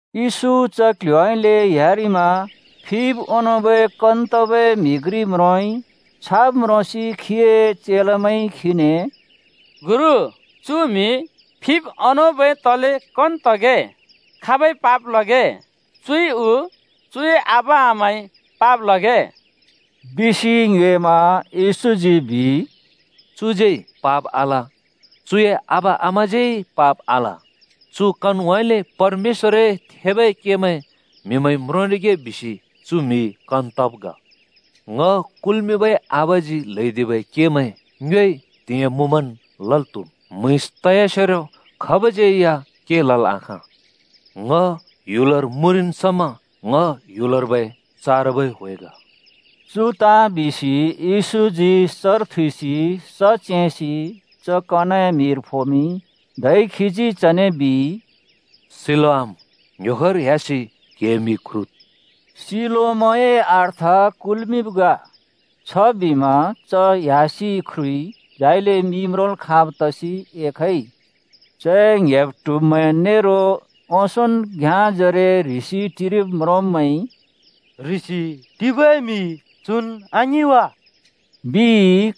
येशू च क्ल्ह्‍योउँइँले ह्‍यारिमा फिब् ओंनोंबै कन तबै म्हि घ्रि म्रोंइ। छाब् म्रोंसि खीए चेलामैंइ खीने, “गुरु, चु म्हि फिब् ओंनोंबै तले कन तगे? खाबइ पाप लगे? चुइ उ चुए आबा-आमाइ पाप लगे?” बिसि ङ्योएमा। येशूजी बिइ, “चुज्यै पाप आल, चुए आबा-आमाज्यै पाप आल। चु कनउँइँले परमेश्‍वरए थेबै केमैं म्हिमैंइ म्रोंरिगे बिसि चु म्हि कन तब् ग। ङ कुल्मिंबै आबाजी ल्‍हैदिबै केमैं ङ्योइ त्हिंयाँ मुँमन् लल् त्हुम्। म्‍हुँइँस त‍यासेरो खाबज्यै के लल् आखाँ। ङ ह्‍युलर मुँरिन् समा ङ ह्‍युलर्बै चारबै ह्‍वे ग।” चु ताँ बिसि येशूजी सर थुइसि स च्‍येंसि च कनए मिर फोमिंइ। धै खीजी चने बिइ, “सिलोआम ङ्‍ह्‍योखोर ह्‍यासि क्‍हिए मि ख्रुद्।” (सिलोआमए अर्थ कुल्मिंब् ग।) छबिमा च ह्‍यासि ख्रुइ, झाइले मि म्रोंल् खाँब् तसि एखइ। चए ङ्‍हेब् ट्हुब्मैं नेरो ओंसोंन् घ्याँजरे ह्रिसि टिरिब् म्रोंब्‍मैंइ “ह्रिसि टिबै म्हि चुन् आङिं वा?” बिइ।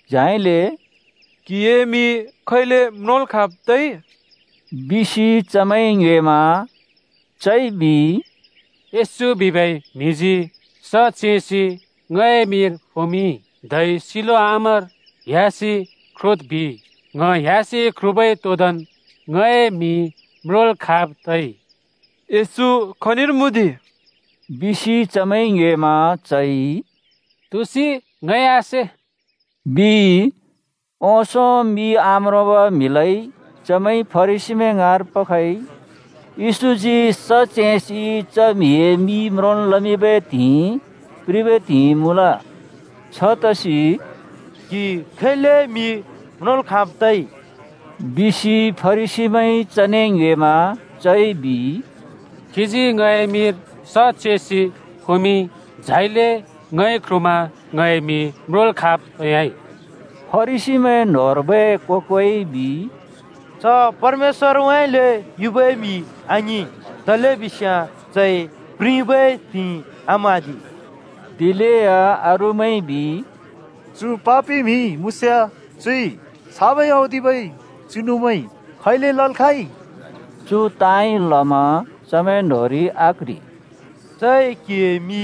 झाइले “क्हिए मि खैले म्रोंल् खाँब् तइ?” बिसि चमैंइ ङ्योएमा। चइ बिइ, “येशू बिबै म्हिजी स च्‍येंसि ङए मिर फोमिंइ, धै ‘सिलोआमर ह्‍यासि ख्रुद्’ बिइ। ङ ह्‍यासि ख्रुबै तोंदोंन् ङए मि म्रोंल् खाँब् तइ।” “येशू खनिर मुँ दि?” बिसि चमैंइ ङ्योएमा चइ “तुसि ङइ आसे,” बिइ। ओंसों मि आम्रोंबै म्हिलाइ चमैंइ फरिसीमैं ङाँर पखइ। येशूजी स च्‍येंसि च म्हिए मि म्रोंल् लमिंबै त्हिंइ प्रिबै त्हिंइ मुँल। छतसि “क्हि खैले मि म्रोंल् खाँब् तइ?” बिसि फरिसीमैंइ चने ङ्योएमा। चइ बिइ, “खीजी ङए मिर स चेंसि फोमिंइ। झाइले ङइ ख्रुमा ङए मि म्रोंल् खाँब् तयाइ।” फरिसीमैं न्होंर्बै को-कोइ बिइ, “च परमेश्‍वरउँइँले युबै म्हि आङिं, तलेबिस्याँ चइ प्रिबै त्हिंइ आम्हाँदि।” दिलेया अरूमैंइ बिइ, “चु पापि म्हि मुँस्याँ, चुइ छाबै औदिबै चिनुमैं खैले लल् खाँइ?” चु ताँइ लमा चमैं न्‍होंरि आक्‍ह्रि। “चइ क्हिए मि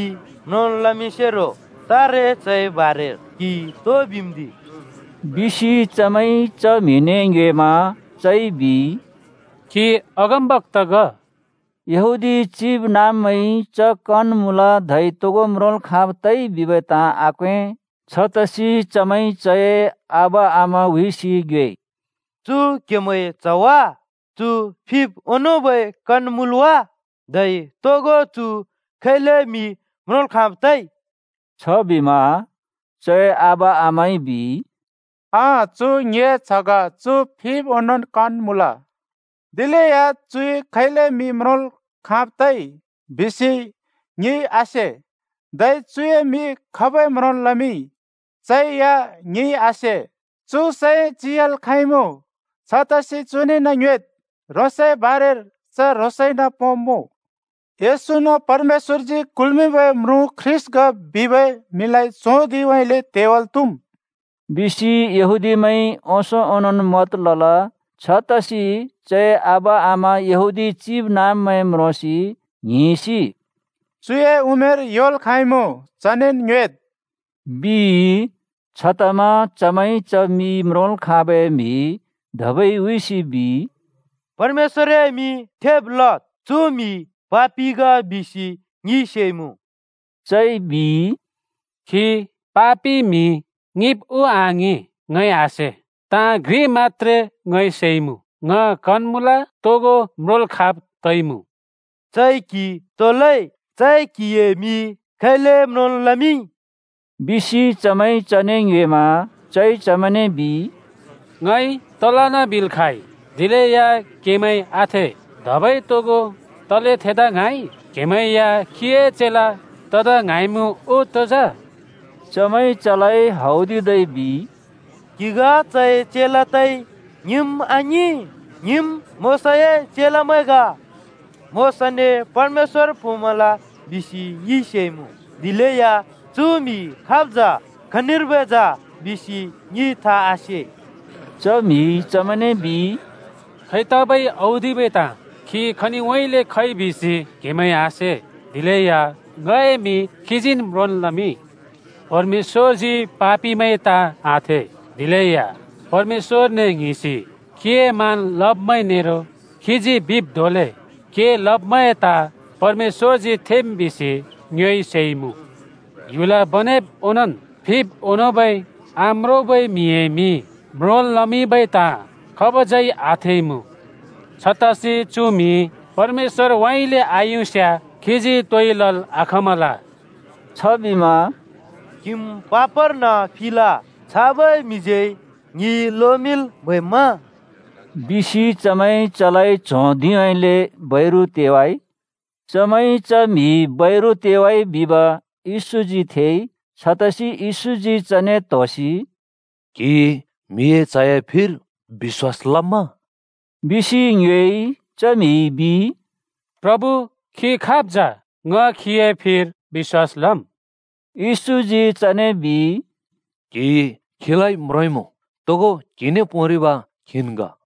म्रोंल् लमिंसेरो तारे चए बारेर क्हिइ तो बिम्दि?” बिसि चमैंइ च म्हिने ङ्योएमा चइ बिइ, “खी अगमबक्‍ता ग।” यहूदी चिबनाँब्मैंइ च कन मुँल धै तोगो म्रोंल् खाँब् तइ बिबै ताँ आक्वें। छतसि चमैंइ चए आबा-आमा हुइसि ङ्योएइ। “चु क्‍हेमैंए च्‍ह वा? चु फिब् ओंनोंबै कन मुँल् वा? धै तोगो चु खैले मि म्रोंल् खाँब् तइ?” छबिमा चए आबा-आमाइ बिइ, “अँ, चु ङिए च्‍ह ग, चु फिब् ओंनोंन् कन मुँल। दिलेया चुइ खैले मि म्रोंल् खाँब् तइ बिसि ङिइ आसे। धै चुए मि खाबइ म्रोंल् लमिंइ, चै या ङिइ आसे। चु सैं चियाल् खाँइमुँ छतसि चुनेन् ङ्योएद्। ह्रोंसए बारेर च ह्रोंसइन पोंब्मुँ।” “येशून् परमेश्‍वरजी कुल्मिंबै म्रुँ ख्रीष्‍ट ग बिबै म्हिलाइ च्हों धिंउँइँले तेवाल त्हुम्,” बिसि यहूदीमैंइ ओंसों ओंनोंन् मत लल। छतसि चए आबा-आमा यहूदी चिबनाँब्मैं म्रोंसि ङ्हिंसि “चुए उमेर योल् खाँइमुँ। चनेन् ङ्योएद्,” बिइ। छतमा चमैंइ च मि म्रोंल् खाबै म्हि धबै हुइसि बिइ, “परमेश्‍वरए मिं थेब् लद्। चु म्हि पापि ग बिसि ङिइ सेइमुँ।” चइ बिइ, “खी पापि म्हि ङिंब् उ आङिं, ङइ आसे। ताँ घ्रि मत्‍त्रे ङइ सेइमुँ। ङ कन मुँल, तोगो म्रोंल् खाँब् तइमुँ।” “चइ क्‍हि तो लइ? चइ क्‍हिए मि खैले म्रोंल् लमिंइ?” बिसि चमैंइ चने ङ्योएमा। चइ चमैंने बिइ, “ङइ तलन् बिल् खाँइ, दिलेया क्‍हेमैंइ आथे। धबै तोगो तले थेदा ङ्हाँइ? क्‍हेमैं या खीए चेला तदा ङ्हाँइमुँ उ तो?” चमैंइ चलाइ हौदिदै बिइ, “क्हि ग चए चेला तइ! ङिम् आङिं! ङिम् मोशाए चेलामैं ग। मोशाने परमेश्‍वर पोंमल बिसि ङिइ सेइमुँ, दिलेया चु म्हि खाब् जा? खनिर्बै जा? बिसि ङिइ था आसे।” च म्हिइ चमैंने बिइ, “खैतबै औदिबै ताँ! खी खनिउँइँले खइ बिसि क्‍हेमैंइ आसे, दिलेया ङए मि खीजीन् म्रोंन् लमिंइ। परमेश्‍वरजी पापिमैं ताँ आथे, दिलेया परमेश्‍वरने ङ्हिंसि खीए मान लब्‍मैं नेरो खीजी बिब् धोंले के लब्‍मैंए ताँ परमेश्‍वरजी थेम् बिसि ङ्योइ सेइमुँ। ह्‍युल बनेब् ओंनोंन् फिब् ओंनोंबै आम्रोंबै म्हिए मि म्रोंल् लमिंबै ताँ खाबज्यै आथेइमुँ! छतसि चु म्हि परमेश्‍वरउँइँले आयुस्‍याँ खीजी तोइ लल् आखाँमल।” छबिमा “क्‍हिम् पापर्न फिल! छाबै म्हिज्यै ङि लोमिंल् म्हैम्मा?” बिसि चमैंइ चलाइ च्हों धिंउँइँले बैरु तेवाइ। चमैंइ च म्हि बैरु तेवाइ बिब येशूजी थेइ, छतसि येशूजी चने त्होसि “क्हि ‘म्हिए च्‍हए’ फिर बिश्‍वास लम्मा?” बिसि ङ्योएइ। च म्हिइ बिइ, “प्रभु, खी खाब् जा? ङ खीए फिर बिश्‍वास लब्मुँ।” येशूजी चने बिइ, “क्‍हिइ खीलाइ म्रोंइमुँ, तोगो क्‍हिने पोंरिब खीन् ग।”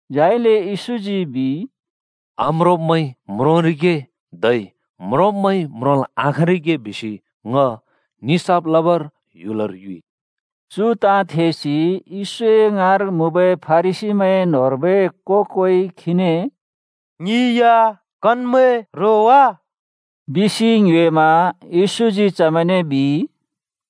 झाइले येशूजी बिइ, “आम्रोंब्मैंइ म्रोंरिगे धै म्रोंब्मैंइ म्रोंल् आखाँरिगे बिसि ङ निसाफ लबर ह्‍युलर युइ।” चु ताँ थेसि येशूए ङाँर मुँबै फरिसीमैंए न्होंर्बै को-कोइ खीने “ङि या कनमैं रो वा?” बिसि ङ्योएमा। येशूजी चमैंने बिइ,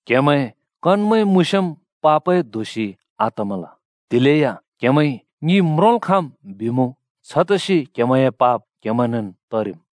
“क्‍हेमैं कनमैं मुँस्‍याँम् पापए दोषि आतमल, दिलेया क्हेमैंइ ‘ङि म्रोंल् खाँम्’ बिमुँ, छतसि क्हेमैंए पाप क्हेमैंनेन् तरिम्।”